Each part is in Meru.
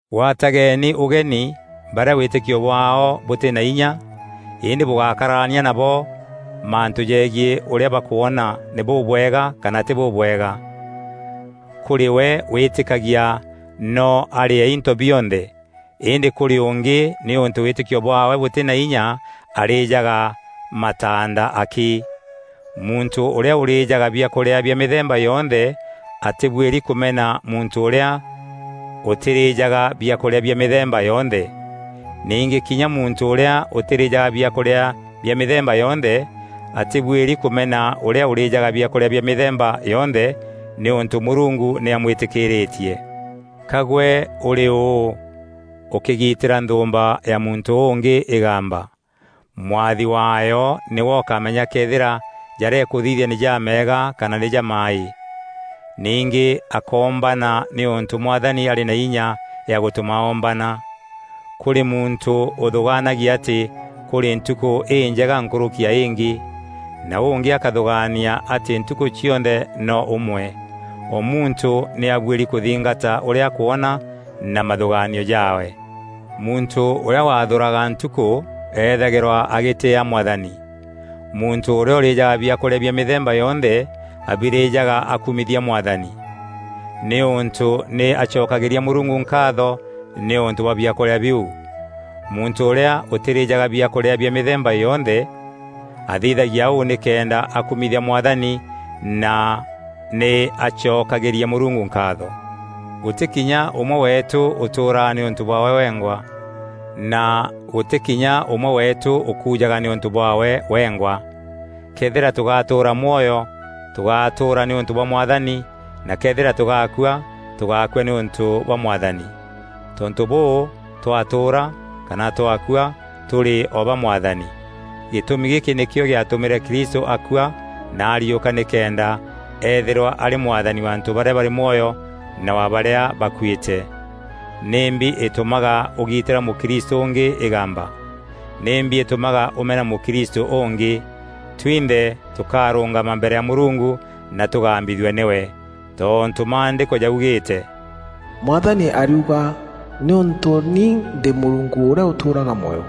Gwatageeni ûgeni barîa wîtîkio bwaao bûtî na inya, îndî bûgákararania nabo mantû jegiî ûrîa bakwona nî bûbwega kana tî bûbwega. Kûrî we wîtîkagia noo arîe into bionthe, îndî kûrî ûngî nîûntû wîtîkio bwaawe bûtî na inya arîjaga mataanda akî. Muntû ûrîa ûrîjaga biakûrîa bia mîthemba yonthe atîbuîri kûmena muntû ûrîa ûtirîjaga biakûrîa bia mîthemba yonthe. Ningî kinya muntû ûrîa ûtîrîjaga biakûrîa bia mîthemba yonthe atîbuîri kûmena ûrîa ûrîjaga biakûrîa bia mîthemba yonthe nîûntû Mûrungu nî amwîtîkîîrîtie. Ka gwe ûrî ûû, ûkîgitîra nthûûmba ya muntû ûngî îgamba? Mwathi waayo nîwe ûkamenya këethîra jarîa îkûthithia nî jameega kana nî jamaaî. Ningî akoombana nîûntû Mwathani arî na inya ya gûtûma oombana. Kûrî muntû ûthûgaanagia atî kûrî ntûkû înjega nkûrûki ya îngî, na ûngî akathûgaania atî ntukû cionthe no ûmwe. O muntû nî abuîri kûthingata ûrîa akwona na mathûgaanio jaawe. Muntû ûrîa waathûraga ntukû eethagîrwa agîtîîa Mwathani. Muntû ûrîa ûrîjaga biakûrîa bia mîthemba yonthe, abirîjaga akumithia Mwathani, nîûntû nî acokagîria Mûrungu nkaatho nîûntû bwa biakûrîa biu. Muntû ûrîa ûtîrîjaga biakûrîa bia mîthemba yonthe, athithagia ûu nîkenda akumithia Mwathani na nî acokagîria Mûrungu nkaatho. Gûtî kinya ûmwe weetû ûtûûraga nîûntû bwaawe wengwa, na gûtî kinya ûmwe weetû ûkuujaga nîûntû bwaawe wengwa. Këethîra tûgatûûra mwoyo, tûgatûûra nîûntû bwa Mwathani na këethîra tûgakua, tûgakua nîûntû bwa Mwathani. Tontû bûû, twatûûra, kana twakua, tûrî o ba Mwathani. Gîtûmi gîkî nîkîo gîatûmîre Kristû akua na ariûka nîkenda eethîrwa arî Mwathani wa antû barîa barî mwoyo na wa barîa bakuîte. Nîmbi îtûmaga ûgitîra mûkristû ûngî îgamba? Nimbi îtûmaga ûmena mûkristû ûngî? Twinthe tûkarûngama mbere ya Mûrungu na tûgambithue nîwe. Tontû Maandîko jaugîîte, “Mwathani ariuga; nîûntû ni ndî Mûrungu ûrîa ûtûûraga mwoyo,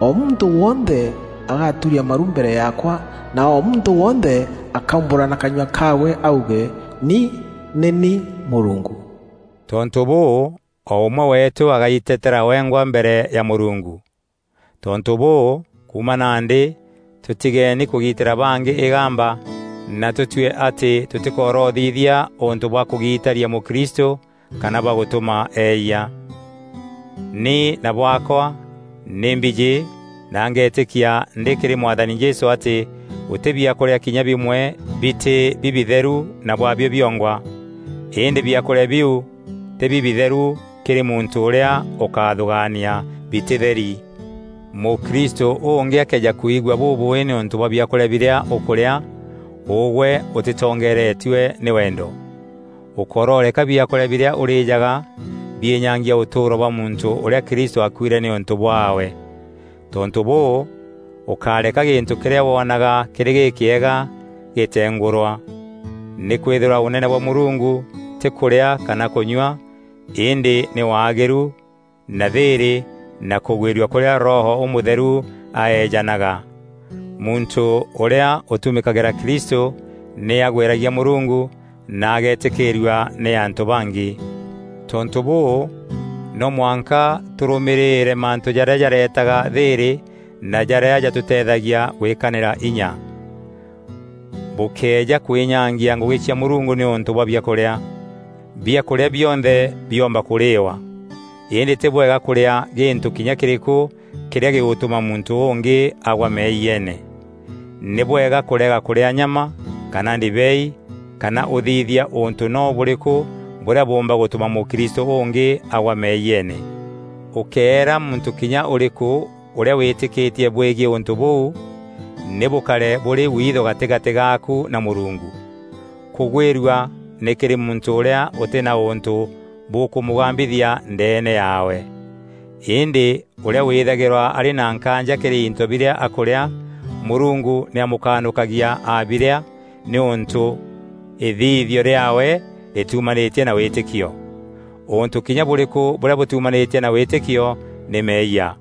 o muntû wonthe agaturia maru mbere yaakwa, na o muntû wonthe akaumbûra na kanyua kaawe auge ni nî ni Mûrungu.” Tontû bûû, o ûmwe weetû agaiteteera wengwa mbere ya Mûrungu. Tontû bûû, kuuma nandî tûtigeeni kûgitîra bangî îgamba na tûtue atî tûtîkorothithia ûntû bwa kûgitaria mûkristû kana bwa gûtûma eeyia. Ni na bwaakwa, nî mbijî na ngeetîkia ndî kîrî Mwathani Jesû atî gûtî biakûrîa kinya bimwe bitî bibitheru na bwaabio biongwa. Îndî biakûrîa biu tî bibitheru kîrî muntû ûrîa ûkathûgaania bitîtheri. Mûkristû ûngî akëeja kwigua bûbûûî nîûntû bwa biakûrîa birîa ûkûrîa, ûgwe ûtîtongeeretue nî wendo. Ûkororeka biakûrîa birîa ûrîjaga biînyangia ûtûûro bwa muntû ûrîa Kristû aakuîre nîûntû bwaawe. Tontû bûû, ûkáreka gîntû kîrîa woonaga kîrî gîkîega gîtengûrwa. Nîkwîthîrwa Ûnene bwa Mûrungu tî kûrîa kana kûnyua, îndî nî waagîru, na thîîrî na kûgwîrua kûrîa Roho Ûmûtheru aeejanaga. Muntû ûrîa ûtumîkagîra Kristû nî agwîragia Mûrungu na ageetîkîîrua nî antû bangî. Tontû bûû, no mwanka tûrûmîîrîre mantû jarîa jaretaga thîîrî, na jarîa jatûteethagia gwîkanîra inya. Bûkéeja kwînyangia ngûgî cia Mûrungu nîûntû bwa biakûrîa. Biakûrîa bionthe biomba kûrîîwa, îndî tî bwega kûrîa gîntû kinya kîrîkû kîrîa gîgûtûma muntû ûngî agwa meeyiene. Nî bwega kûrega kûrîa nyama kana ndibei kana ûthithia ûntû noo bûrîkû bûrîa bûûmba gûtûma mûkristû ûngî agwa meeyiene. Ûkéera muntû kinya ûrîkû ûrîa wîtîkîtie bwegiî ûntû bûu, nî bûkare bûrî witho gatîgatî gaaku na Mûrungu. Kûgwîrua nî kîrî muntû ûrîa ûtî na ûntû bûkûmûgambithia ndeene yaawe. Îndî ûrîa wîthagîrwa arî na nkaanja kîrî into birîa akûrîa, Mûrungu nî amûkanûkagia aabirîa, nîûntû îthithio riaawe rîtiumanîtie na wîtîkio. Ûntû kinya bûrîkû bûrîa bûtîumanîtie na wîtîkio nî meeyia.